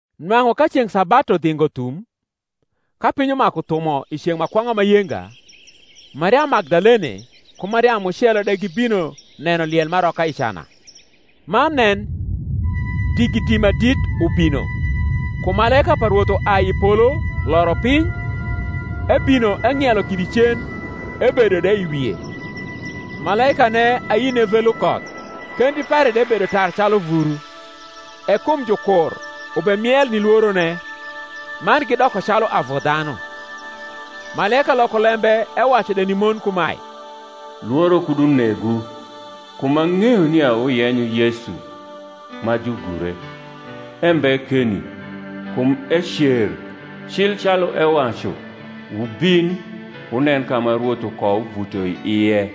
Nwang’u ka ceng’ sabatu dhingo thum, ka piny umaku thumo i ceng’ ma kwong’a ma yenga, Mariamu Magdalene ku Mariamu mucelo de gibino neno liel m’aroka i cana. Man nen, digidi ma dit ubino; kum malaika pa Rwoth uai i polo loro piny, ebino eng’ielo kidi cen, ebedo de i wie. Malaikane ayine ve lukoth, kendi pare de bedo tar calu vuru: e kum jukur ubemiel ni lworone, man gidoko calu avu dhanu. Malaika loko lembe ewacu de ni mon kumae, Lworo kud unegwu: kum ang’eyo nia wuyenyo Yesu, ma jugure. Embe keni; kum ecer, cil calu ewacu. Wubin, wunen ka ma Rwoth ukouvuto i ie.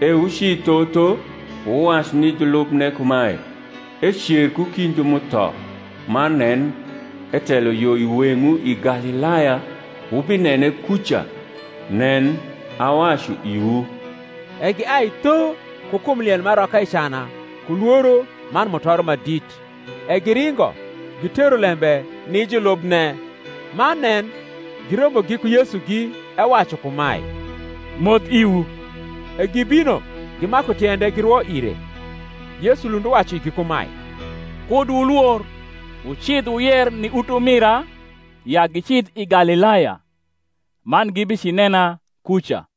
E wuci tho tho, wuwac ni julubne kumae, Ecer ku kind ju m’utho; man nen, etelo yo i weng’wu i Galilaya; wubinene kuca: nen, awacu iwu. E giai tho ku kum liel m’aroka i cana ku lworo man mutoro ma dit, e giringo gitero lembe ni julubne. Man nen, girombo giku Yesugi, ewacu kumae, Moth iwu. E gibino gimaku tiende, girwo ire. Yesu lund uwacu igi kumae, Kud wulwor: wucidh wuyer ni utumira ya gicidh i Galilaya man gibicinena kuca.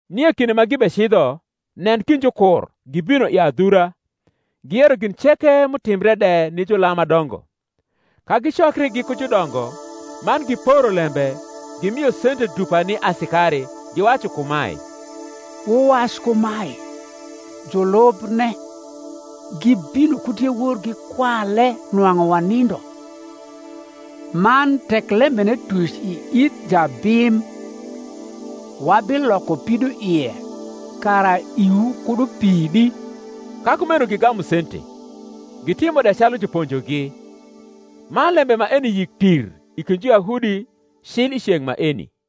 Nie kinde ma gibecidho, nen, kind jukur gibino i adhura, giyero gin ceke m’utimbre de ni julam ma dongo. Ka gicokri giku judongo, man giporo lembe, gimio sente dupa ni asikari, giwacu kumae, Wuwac kumae, Julubne gibino ku diewor, gikwale nwang’u wanindo. Man tek lembene tuc i ith jabim, wabiloko pidoie, kara iwu kud upidi. Ka kumeno gigamu sente, gitimo de calu juponjogi: man lembe maeni yik tir i kind Juyahudi, cil i ceng’ maeni.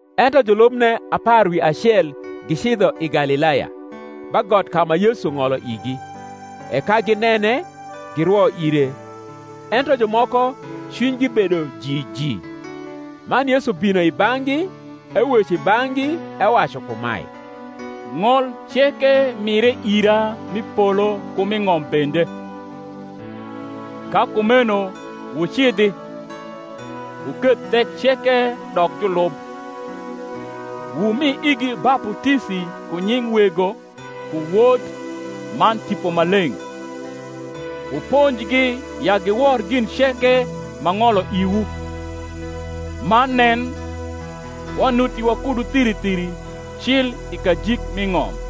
Ento julubne apar wi acel gicidho i Galilaya, ba got ka ma Yesu ng’olo igi. E ka ginene, girwo ire; ento jumoko cwinygi bedo jiji. Man Yesu bino i bang’gi eweco i bang’gi, ewacu kumae, Ng’ol ceke mire ira m’i polo ku m’i ng’om bende. Ka kumeno wucidhi, wuketh thek ceke dok julub, wumi igi baputisi ku nying Wego ku Wod man Tipo Maleng’: wuponjgi ya giwor gin ceke m’ang’olo iwu: man nen, wanuti wakudu thiri thiri, cil i kajik mi ng’om.